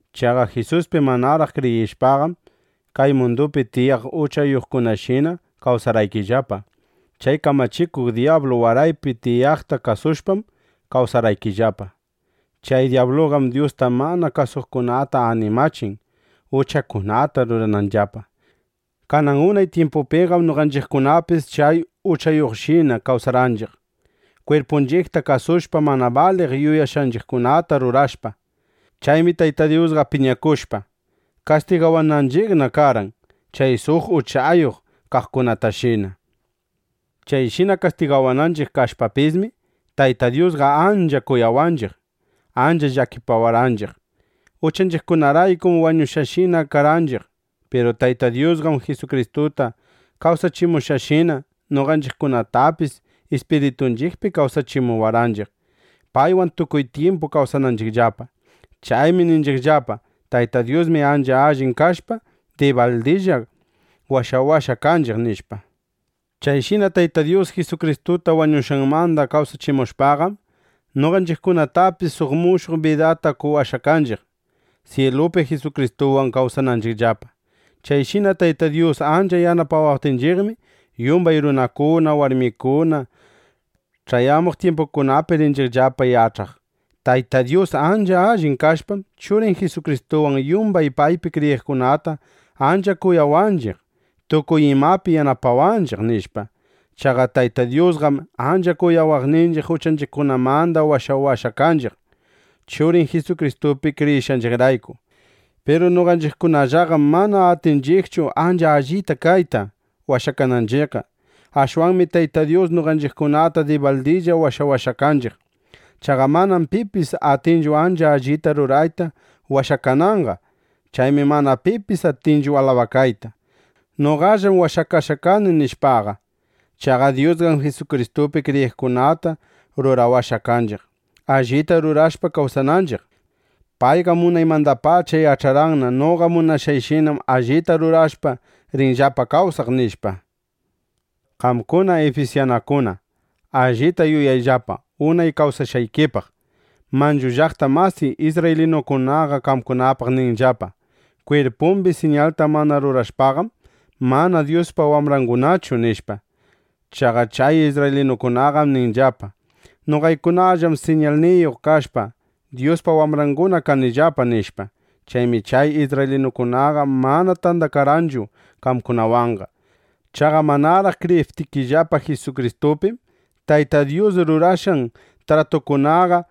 Chaqa Jisuspi manaraq kriyishpaqam, kay mundupi tiyaq uchayuqkunashina kawsarqaykillapa. Chay kamachikuq dyablu wayrapi tiyaqta kasushpam kawsarqaykillapa. Chay dyabluqam Dyusta mana kasuqkunata animachin, uchakunata rurananllapa. Kanan unay tyimpupiqam noqanchiqkunapis chay uchayuqkunashina kawsarqanchiq, kwirpunchiqta kasushpa, mana baliq yuyashqanchiqkunata rurashpa. Chaymi Tayta Dyusqa piñakushpa, kastigawananchiqna karqan, chay suq uchayuq kaqkunatashina. Chayshina kastigawananchiq kashpapismi, Tayta Dyusqa ancha kuyawaqninchiq, ancha llakipawarqanchiq. Uchanchiqkunaraykum wañushqashina karqanchiq. Piru Tayta Dyusqam, Jisukristuta kawsachimushqanshina, noqanchiqkunatapis ispiritunchiqpi kawsachiwarqanchiq, paywan tukuy tyimpu kawsananchiqllapa. Chaymi ninchiqllapa: “Tayta Dyusmi ancha allin kashpa, dibaldilla washawashqa kanchiq”, nishpa. Chayshina Tayta Dyus Jisukristuta wañushqanmanda kawsachimushpaqam, noqanchiqkunatapis suq mushuq bidata qowashqa kanchiq, syilupi Jisukristuwan kawsananchiqllapa. Chayshina Tayta Dyus ancha yanapawaptinchiqmi, yumbay runakuna, warmikuna ch'ayamuq tyimpukunapi rinchiqllapa yach'aq: ¡Tayta Dyus ancha allin kashpam, Churin Jisukristuwan yumbay paypi kriyiqkunata ancha kuyawaqninchiq, tukuy imapi yanapawanchiq! nishpa. Chaqa Tayta Dyusqam ancha kuyawaqninchiq, uchanchiqkunamanda washawashqa kanchiq, Churin Jisukristupi kriyishqanchiqrayku. Piru noqanchiqkunallaqam mana atinchiqchu ancha allin kayta, washakananchiqqa. Ashwanmi Tayta Dyus noqanchiqkunata dibaldilla washawashqa kanchiq. Chaqa manam pipis atinchu ancha allita rurayta washakananqa. Chaymi mana pipis atinchu alabakayta: Noqallam washakashqa kani, nishpaqa. Chaqa Dyusqam Jisukristupi kriyiqkunata rurawashqa kanchiq, allita rurashpa kawsananchiq. Payqam unaymandapacha yach'arqanna: Noqa munashqayshinam allita rurashpa rinllapa kawsaq, nishpa. Qamkuna ifisyanukuna, allita yuyayllapa unay kawsashqaykipaq. Manchu llaqta masiy isrraylinukunaqa qamkunapaq ninllapa: “Kwirpumbi siñalta mana rurashpaqam, mana Dyuspa wambrangunachu”, nishpa. Chaqa chay isrraylinukunaqam ninllapa: “Noqaykunallam siñalniyuq kashpa, Dyuspa wambranguna kanillapa”, nishpa. Chaymi chay isrraylinukunaqa mana tandakarqanchu qamkunawanqa. Chaqa manaraq kriyiptikillapa Jisukristupim, Tayta Dyus rurashqan tratukunaqa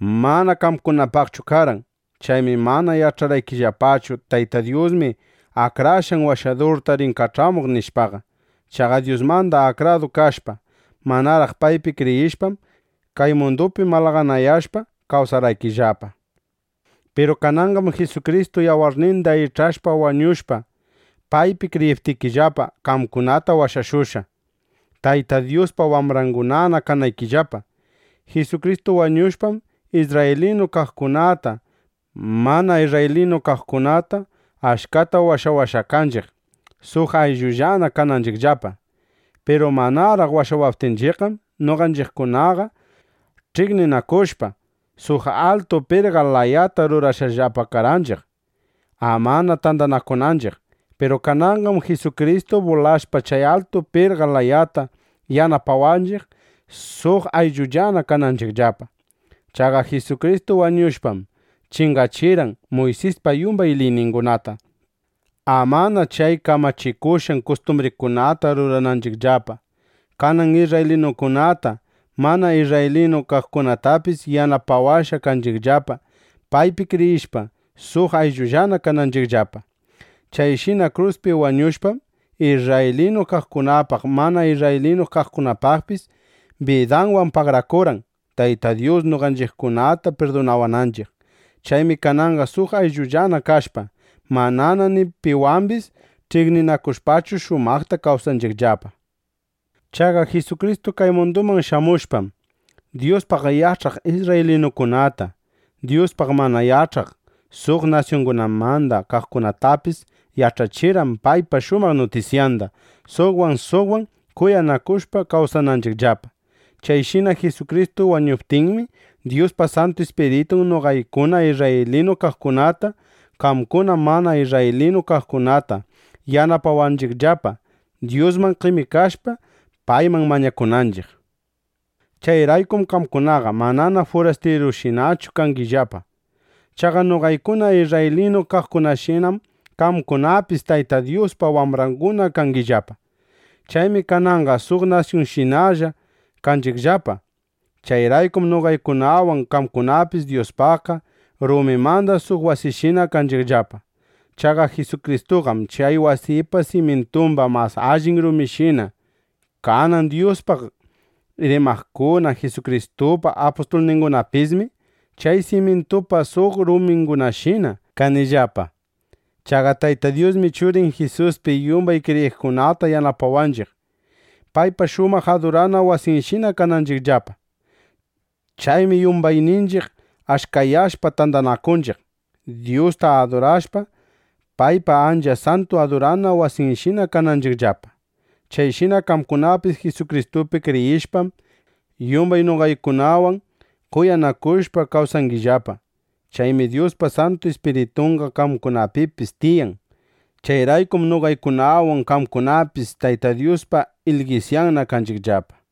mana qamkunapaqchu karqan. Chaymi mana yach'arqaykillapachu: Tayta Dyusmi Akrashqan Washadurta rin kach'amuq, nishpaqa. Chaqa Dyusmanda akrakadu kashpa, manaraq paypi kriyishpam, kay mundupi malaganayashpaqa kawsarqaykillapa. Piru kananqam Jisukristu yawarninda ich'ashpa wañushpa, paypi kriyiptikillapa, qamkunata washashushqa, Tayta Dyuspa wambrangunana kanaykillapa. Jisukristu wañushpam, isrraylinu kaqkunata, mana isrraylinu kaqkunata achkata washawashqa kanchiq, suq ayllullana kananchiqllapa. Piru manaraq washawaptinchiqqam, noqanchiqkunaqa ch'iqninakushpa, suq altu pirqa layata rurashqallapa karqanchiq, ama tandanakunanchiq. Piru kananqam Jisukristu bulashpa chay altu pirqa layata, yanapawanchiq, suq ayllullana kananchiqllapa. Chaqa Jisukristu wañushpam, chingachirqan Muysispa yumbay liyningunata, amana chay kamachikushqan kustumbrikunata rurananchiqllapa. Kanan isrraylinukunata, mana isrraylinu kaqkunatapismi yanapawashqa kanchiqllapa, paypi kriyishpa, suq ayllullana kananchiqllapa. Chayshina kruspi wañushpam, isrraylinu kaqkunapaq, mana isrraylinu kaqkunapaqpis bidanwan pagarakurqan, Tayta Dyus noqanchiqkunata pirdunawananchiq. Chaymi kananqa suq ayllullana kashpa, manana ni piwambis ch'iqninakushpachu shumaqta kawsanchiqllapa. Chaqa Jisukristu kay munduman shamushpam, Dyuspaq yach'aq isrraylinukunata, Dyuspaq mana yach'aq suq nasyungunamanda kaqkunatapis yach'achirqan paypa shumaq nutisyanda, suqwan suqwan kuyanakushpa kawsananchiqllapa. Chayshina Jisukristu wañuptinmi, Dyuspa Santu Ispiritun noqaykuna isrraylinu kaqkunata, qamkuna mana isrraylinu kaqkunata yanapawanchiqllapa, Dyusman qemikashpa, payman mañakunanchiq. Chayraykum qamkunaqa manana furastirushinachu kangillapa. Chaqa noqaykuna isrraylinu kaqkunashinam qamkunapis Tayta Dyuspa wambranguna kangillapa. Chaymi kananqa suq nasyunshinallana kanchiqllapa. Chayraykum noqaykunawan qamkunapis Dyuspaqqa rumimanda suq wasishina kanchiqllapa. Chaqa Jisukristuqam chay wasipa simyintumba mas allin ruminshina. Kanan Dyuspaq rimaqkuna, Jisukristupa apustulningunapismi chay simyintupa suq rumingunashina kanillapa. Chaqa Tayta Dyusmi Churin Jisuspi yumbay kriyiqkunata yanapawanchiq, paypa shumaq adurana wasinshina kananchiqllapa. Chaymi yumbayninchiq achkayashpa tandanakunchiq, Dyusta adurashpa, paypa ancha santu adurana wasinshina kananchiqllapa. Chayshina qamkunapis Jisukristupi kriyishpam, yumbay noqaykunawan kuyanakushpa kawsangillapa. Chaymi Dyuspa Santu Ispiritunqa qamkunapipis tiyan. Chayraykum noqaykunawan qamkunapis Tayta Dyuspa ilgisyanna kanchiqllapa.